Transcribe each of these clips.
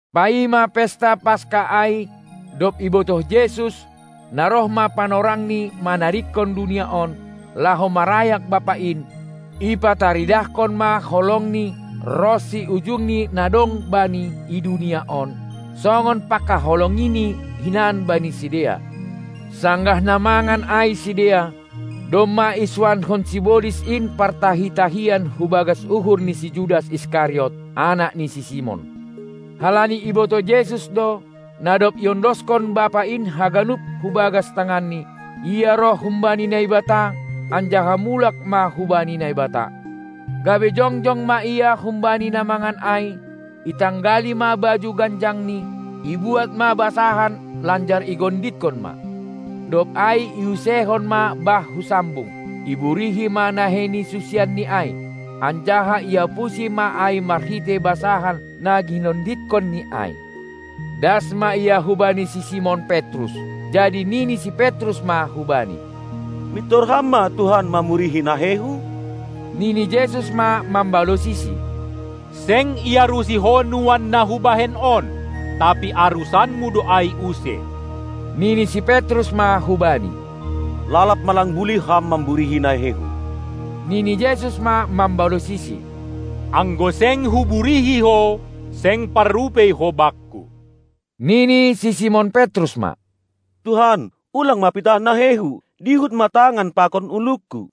Paima pesta Paska ai, dob ibotoh Jesus, na roh ma panorangni manadingkon dunia on, laho marayak Bapa in, ipataridahkon ma holongNi ronsi ujungni na dong Bani i dunia on, songon pangkaholongiNi hinan bani sidea. Sanggah na mangan ai sidea, domma isuanhon sibolis in partahi-tahian hubagas uhur ni si Judas Iskariot, anak ni si Simon. Halani ibotoh Jesus do, na dob iondoskon Bapa in haganup hubagas tanganNi, Ia roh humbani Naibata anjaha mulak ma hubani Naibata, gabe jongjong ma Ia humbani na mangan ai, itanggali ma baju ganjang ni, ibuat ma basahan lanjar igonditkon ma. Dob ai iuseihon ma bah hu sambung, iburihi ma nahei ni susianNi ai, anjaha iapusi ma ai merhitei basahan na ginonditkonNi ai. Das ma Ia hubani si Simon Petrus, jadi nini si Petrus ma hu Bani: Mintor Ham ma Tuhan mamurihi naheihu? Nini Jesus ma mambalosisi: Seng iarusi ho nuan na Hubahen on, tapi arusanmu do ai use. Nini si Petrus ma hubani: Lalap ma lang bulih Ham mamburihi naheihu. Nini Jesus ma mambalosisi: Anggo seng Huburihi ho, seng parrupei ho Bakku. Nini si Simon Petrus ma: Tuhan, ulang ma pitah naheihu, dihut ma tangan pakon ulungku!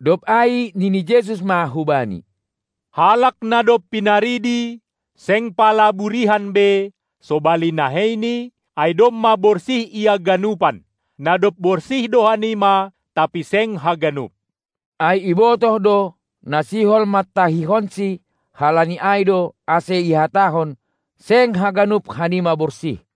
Dob ai nini Jesus ma hubani: Halak na dob pinaridi, seng pala burihan be (sobali naheini), ai domma borsih ia ganupan. Na dob borsih do hanima, tapi seng haganup. Ai ibotoh do, na sihol mantahihonsi, halani ai do, ase ihatahon: Seng haganup hanima borsih!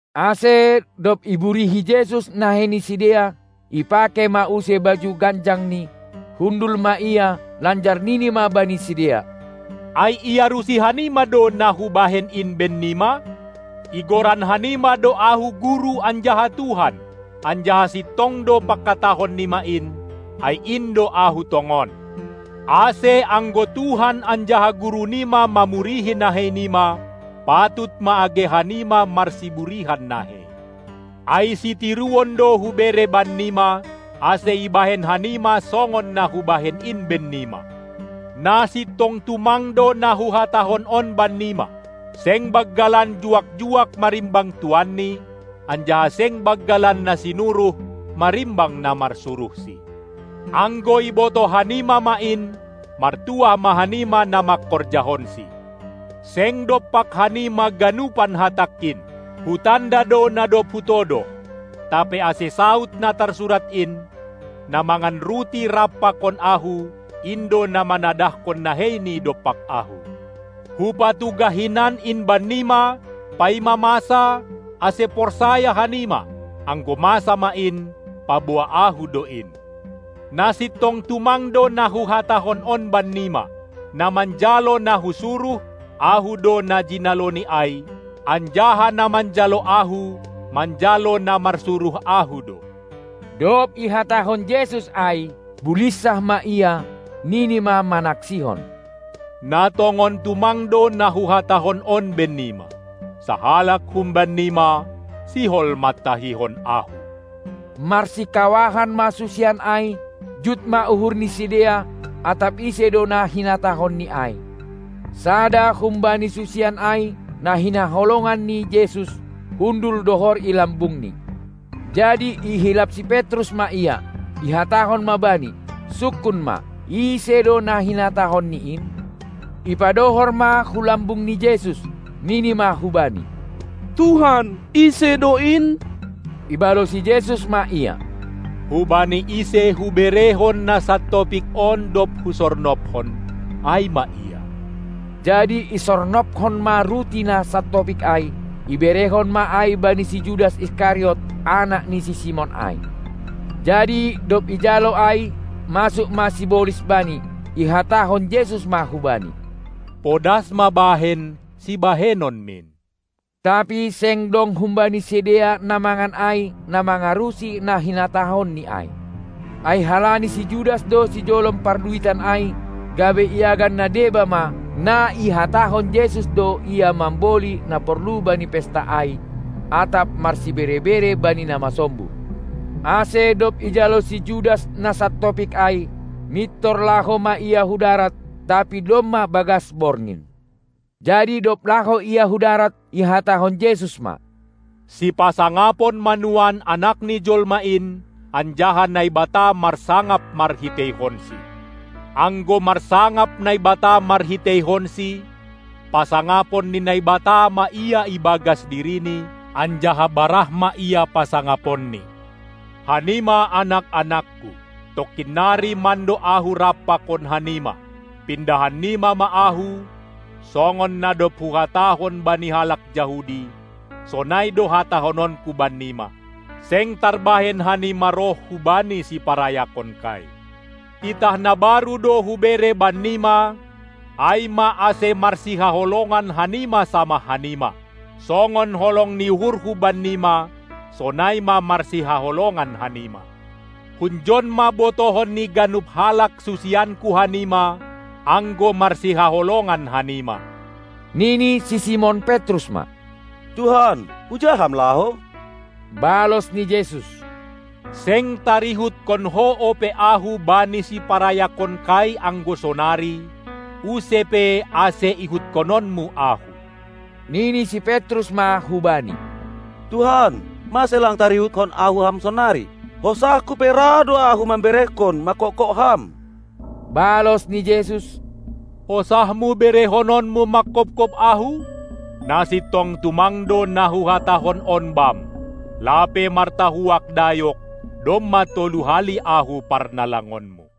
Ase, dob iburihi Jesus nahei ni sidea, ipakei ma use baju ganjangNi, hundul ma Ia, lanjar nini ma bani sidea: Ai iarusi hanima do na Hubahen in bennima? Igoran hanima do Ahu Guru anjaha Tuhan, anjaha sintong do pangkatahon nima in, ai in do Ahu tongon. Ase anggo Tuhan anjaha Guru nima mamurihi nahei nima, patut ma age hanima marsiburihan nahei! Ai sitiruon do Hubere bannima, ase ibahen hanima songon na Hubahen in bennima. Na sintong tumang do na Huhatahon on bannima: Seng banggalan juak-juak marimbang tuanni, anjaha seng banggalan na sinuruh marimbang na marsuruhsi. Anggo ibotoh hanima ma in, martuah ma hanima na mangkorjahonsi. Seng dompak hanima ganupan hatangKin, Hutanda do na dob Hutodoh. Tapi ase saud na tarsurat in: Na mangan ruti rap pakon Ahu, in do na manadahkon neheini dompak Ahu. Hupatugah hinan in bannima, paima masa, ase porsaya hanima, anggo masa ma in, paboa Ahu do in. Na sintong tumang do na Huhatahon on bannima: Na manjalo na Husuruh, Ahu do na jinaloni ai, anjaha na manjalo Ahu, manjalo na marsuruh Ahu do. Dob ihatahon Jesus ai, bulinsah ma Ia, nini ma manaksihon: Na tongon tumang do na Huhatahon on bennima: Sahalak humbannima sihol mantahihon Ahu. Marsikawahan ma susian ai, jut ma uhur ni sidea, atap ise do na hinatahonNi ai. Sada humbani susian ai, na hinaholongan ni Jesus, hundul dohor i lambungNi. jadi ihilap si Petrus ma ia, ihatahon ma bani: Sungkun ma, ise do na hinatahonNi in! Ipadohor ma hu lambung ni Jesus, nini ma hu-Bani: Tuhan, ise do in? Ibalosi Jesus ma ia: Hubani ise Huberehon na santopik on, dob Husornobhon, ai ma ia. Jadi isornobkon ma ruti na santopik ai, iberehon ma ai bani si Judas Iskariot, anak ni si Simon ai. Jadi dob ijalo ai, masuk ma sibolis bani. Ihatahon Jesus ma hubani: Podas ma bahen sibahenonmin! Tapi seng dong humbani sidea na mangan ai, na mangarusi na hinatahonni ai. Ai halani si Judas do sijolom parduitan ai, gabe iagan na deba ma, na ihatahon Jesus do ia mamboli na porlu bani pesta ai, atap marsibere-bere bani na masombuh. Ase dob ijalo si Judas na santopik ai, mintor laho ma ia hu darat. Tapi domma bagas borngin. Jadi dob laho ia hu darat, ihatahon Jesus ma: Sipasangapon ma nuan Anak ni jolma in, anjaha Naibata marsangap marhiteihonSi. Anggo marsangap Naibata marhiteihonSi, pasangapon ni Naibata ma Ia ibagas Dirini, anjaha barah ma Ia pasangaponNi. Hanima anak-anakKu, tongkin nari mando Ahu rap pakon hanima. Pindahan nima ma Ahu; songon na dob Huhatahon bani halak Jahudi, sonai do hatahononKu bannima: Seng tarbahen hanima roh hubani siparayakonkai. Titah na baru do hubere bannima, ai ma, ase marsihaholongan hanima samah hanima. Songon holong ni uhurHu bannima, sonai ma marsihaholongan hanima. Hunjon ma botohon ni ganup halak susianKu hanima, anggo marsihaholongan hanima. Nini si Simon Petrus ma: Tuhan, huja Ham laho? Balos ni Jesus: Seng tarihutkon ho ope Ahu bani siparayakonKai anggo sonari, use pe ase ihutkononmu Ahu. Nini si Petrus ma hu Bani: Tuhan, mase lang tarihutkon ahu Ham sonari? Hosahku pe ra do ahu memberehon mangkopkop Ham! Balos ni Jesus: Hosahmu berehononmu mangkopkop Ahu? Na sintong tumang do na Huhatahon on bam: Lape martahuak dayok, domma tolu hali Ahu parnalangonmu.